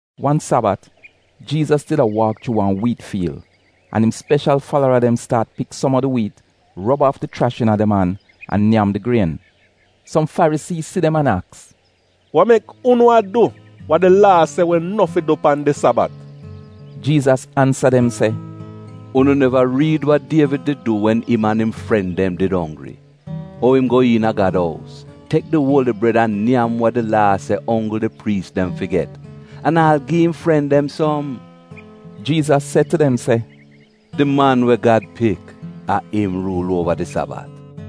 Wan Sabat, Jiizas did a waak chuu wan wiit fiil, an im speshal falara dem staat pik som a di wiit, rob aaf di chrash iina dem an an nyam di grien. Som Farisii si dem an aks, “Wa mek unu a du wa di Laa se wi no fi du pan di Sabat?” Jiizas ansa dem se, “Unu neva riid wa Dievid did du wen im an im fren dem did onggri? Ou im go iina Gad ous, tek di uoli bred an nyam wa di Laa se onggl di priis dem fi get, an aal gi im fren dem som?” Jiizas se tu dem se, “Di Man we Gad Pik, a im ruul uova di Sabat.”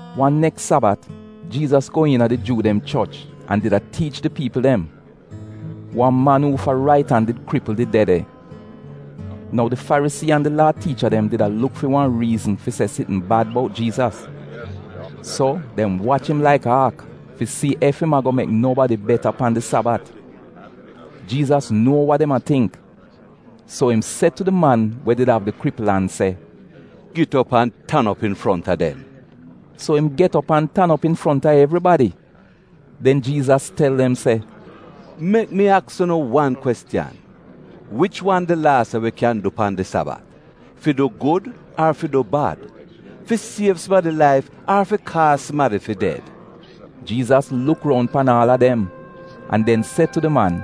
Wan neks Sabat, Jiizas go iina di Juu dem choch an did a tiich di piipl dem. Wan man uufa rait an did kripl, did de de. Nou di Farisii an di Laa tiicha dem did a luk fi wan riizn fi se sitn bad bout Jiizas. So, dem wach im laik aak fi si ef im ago mek nobadi get beta pan di Sabat. Jiizas nuo wa dem a tingk, so im se tu di man wid di kripl an se, “Git op an tan op infronta dem.” So im get op an tan op infronta evribadi. Den Jiizas tel dem se, “Mek mi aks unu wan kwestiyan, wich wan di Laa se wi kyan du pan di Sabat: fi du gud ar fi du bad, fi siev sumadi laif ar fi kaaz sumadi fi ded?” Jiizas luk roun pan aal a dem, an den se tu di man,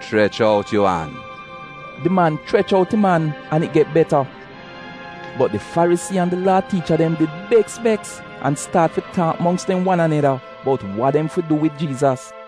“Chrech out yu an.” Di man chrech out im an, an it get beta. Bot di Farisii an di Laa tiicha dem did beks beks an staat fi taak mongks dem wan aneda bout wa dem fi du wid Jiizas.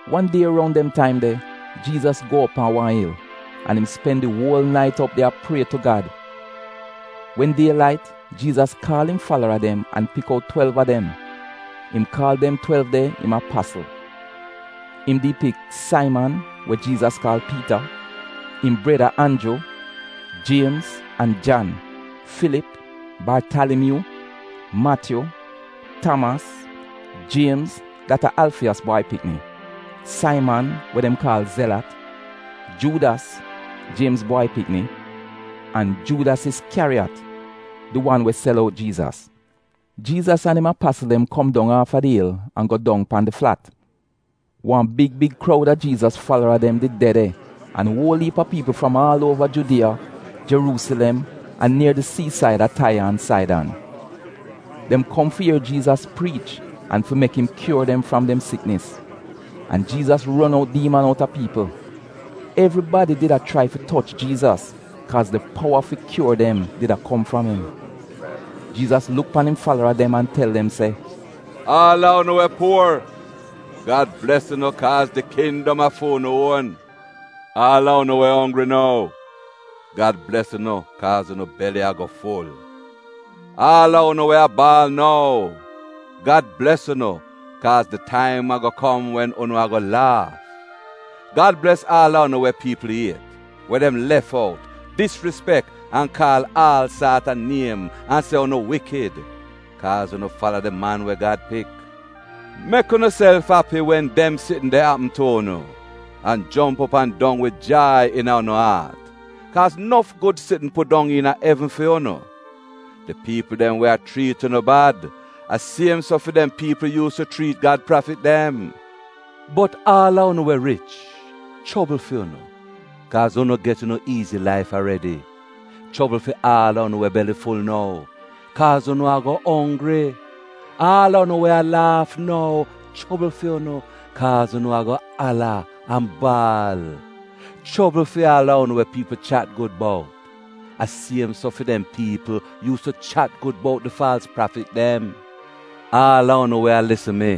Wan die roun dem taim de, Jiizas go op pan wan il, an im spen di uol nait op de a prie tu Gad. Wen die lait, Jiizas kaal im falara dem an pik out twelv a dem. Im kaal dem twelv de im apasl. Im di pik: Saiman (we Jiizas kaal Piita), im breda Anju, Jiemz an Jan, Filip, Bartalimyuu, Matyu, Tamas, Jiemz (dat a Alfiyos bwai pikni), Saiman we dem kaal Zelat, Juudas (Jiemz bwai pikni), an Juudas Iskyariyat, di wan we sel out Jiizas. Jiizas an im apasl dem kom dong aafa di il an go dong pan di flat. Wan big big kroud a Jiizas falara dem did de de an uol iip a piipl fram aal uova Judiya, Jeruusilem, an nier di siisaid a Taiya an Saidan. Dem kom fi ier Jiizas priich an fi mek im kyuor dem fram dem siknis. An Jiizas ron out diiman outa piipl. Evribadi did a chrai fi toch Jiizas, kaaz di powa fi kyuor dem did a kom fram im. Jiizas luk pan im falara dem an tel dem se, “Aal a unu we puor, Gad bles unu kaaz di kindom a fu'unu uon. Aal a unu we onggri nou, Gad bles unu kaaz unu beli ago ful. Aal a unu we a baal nou, Gad bles unu kaaz di taim ago kom, wen unu ago laaf. Gad bles aal a unu we piipl iet, we dem lef out, disrispek an kaal aal saat a niem an se unu wikid, kaaz unu fala di Man we Gad Pik. “Mek unuself api wen dem sitn de apm tu unu, an jomp op an dong wid jai iina unu aat, kaaz nof gud sitn pudong iina evn fi unu. Di piipl dem we a chriit unu bad, a siem so fi dem piipl yuus tu chriit Gad prafit dem “Bot aal a unu we rich — chobl fi unu, kaaz unu get unu iizi laif aredi. Chobl fi aal a unu we beli ful nou, kaaz unu ago onggri. Aal a unu we a laaf nou — chobl fi unu, kaaz unu ago ala an baal. Chobl fi aal a unu we piipl chat gud bout, a siem so fi dem piipl yuus tu chat gud bout di faalz prafit dem. “Aal a unu we a lisn mi,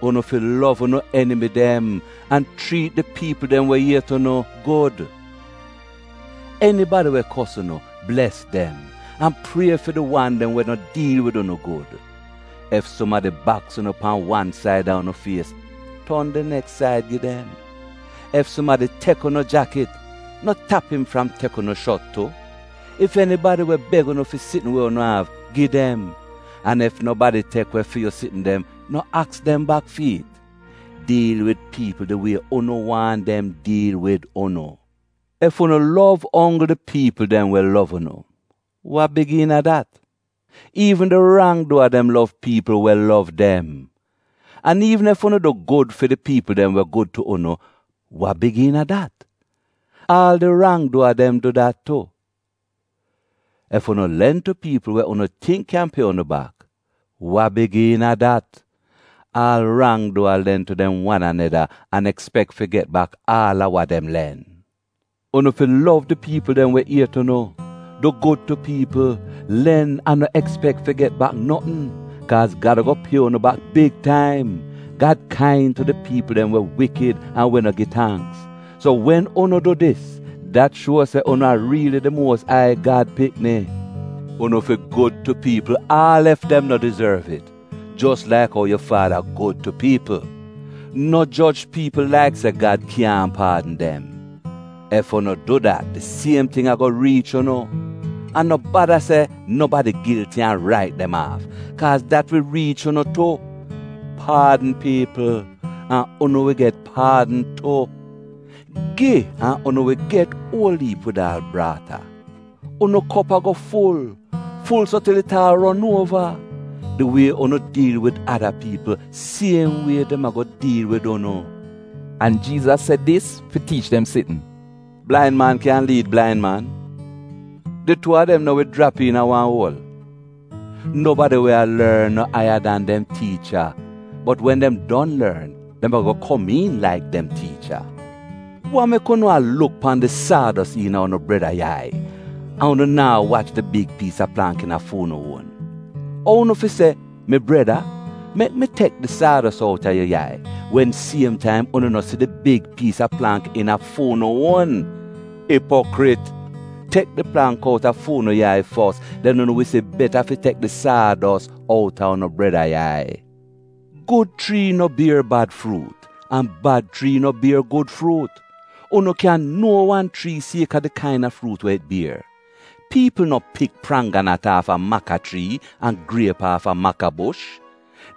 unu fi lov unu enimi dem an chriit di piipl dem we iet unu gud. Enibadi we kos unu, bles dem, an prie fi di wan dem we no diil wid unu gud. Ef sumadi baks unu pan wan said a unu fies, ton di neks said gi dem. Ef sumadi tek unu jakit, no tap im fram tek unu shot tu. Ef enibadi we beg unu fi sitn we unu av, gi dem. An ef nobadi tek we fi yu sitn dem, no aks dem bak fi it. Diil wid piipl di wie unu waahn dem diil wid unu. “Ef unu lov onggl di piipl dem we lov unu, wa big iina dat? Iivn di rang-duwa dem lov piipl we lov dem. An iivn ef unu du gud fi di piipl dem we gud tu unu, wa big iina dat? Aal di rang-duwa dem du dat tu! Ef unu len tu piipl we unu tingk kyan pie unu bak, wa big iina dat? Aal rang-duwa len tu dem wan aneda an ekspek fi get bak aal a wa dem len. Unu fi lov di piipl dem we iet unu. Du gud tu piipl, len an no ekspek fi get bak notn. Kaaz Gad ago pie unu bak big taim. Gad kain tu di piipl dem we wikid an we no gi tangks. So wen unu du dis, dat shuo se unu a riili di Muos Ai Gad pikini. Unu fi gud tu piipl aal ef dem no dizorv it, jos laik ou yu faada gud tu piipl. “No joj piipl laik se Gad kyaahn paadn dem. Ef unu du dat di siem ting ago riich unu. An no bada se nobadi gilti an rait dem aaf, kaaz dat wi riich unu tu. Paadn piipl, an unu wi get paadn tu. Gi an unu wi get uol iip wid aal braata. Unu kop ago ful — ful so til it aal a ron uova. Di wie unu diil wid ada piipl, siem wie dem ago diil wid unu.” An Jiizas se dis fi tiich dem sitn: “Blain man kyan liid blain man? Di tuu a dem no wi jrap iina wan uol? Nobadi we a lorn no aiya dan dem tiicha. Bot wen dem don lorn, dem ago komiin laik dem tiicha. “Wa mek unu a luk pan di saados iina unu breda yai an unu naa wach di big piis a plangk iina fu'unu uon? Ou unu fi se, ‘Mi breda, mek mi tek di saados outa yu yai,’ Wen siem taim unu no si di big piis a plangk iina fu'unu uon? Ipokrit! Tek di plangk outa fu'unu yai fos, den unu wi si beta fi tek di saados outa unu breda yai. “Gud chrii no bier bad fruut, an bad chrii no bier gud fruut. Unu kyan nuo wan chrii kaaz a di kaina fruut we it bier. Piipl no pik prangganat aafa maka chrii an griep aafa makabush.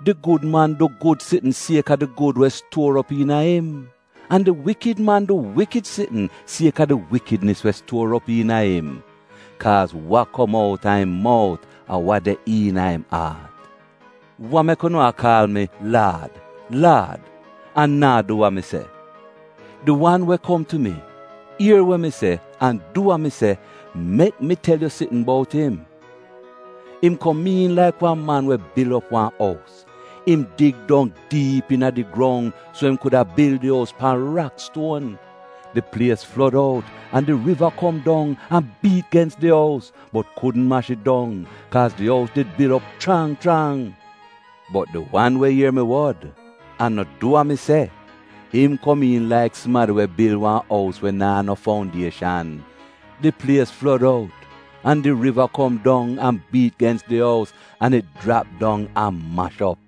Di gud man du gud sitn kaaz a di gud we stuor op iina im. An di wikid man du wikid sitn kaaz a di wikidnis we stuor op iina im. Kaaz wa kom outa im mout a wa de iina im aat. “Wa mek unu a kaal mi, ‘Laad, Laad,’ an naa du wa mi se? Di wan we kom tu mi, ier we mi se an du wa mi se, mek mi tel yu sitn bout im. Im komiin laik wan man we bil op wan ous — im dig dong diip iina di grong so im kuda bil di ous pan rakstuon. Di plies flod out an di riva kom dong an biit gens di ous, bot kudn mash it dong, kaaz di ous did bil op chrang chrang. Bot di wan we ier mi wod an no du wa mi se, im komiin laik sumadi we bil wan ous we naa no foundieshan. Di plies flod out an di riva kom dong an biit gens di ous an it jrap dong an mash op.”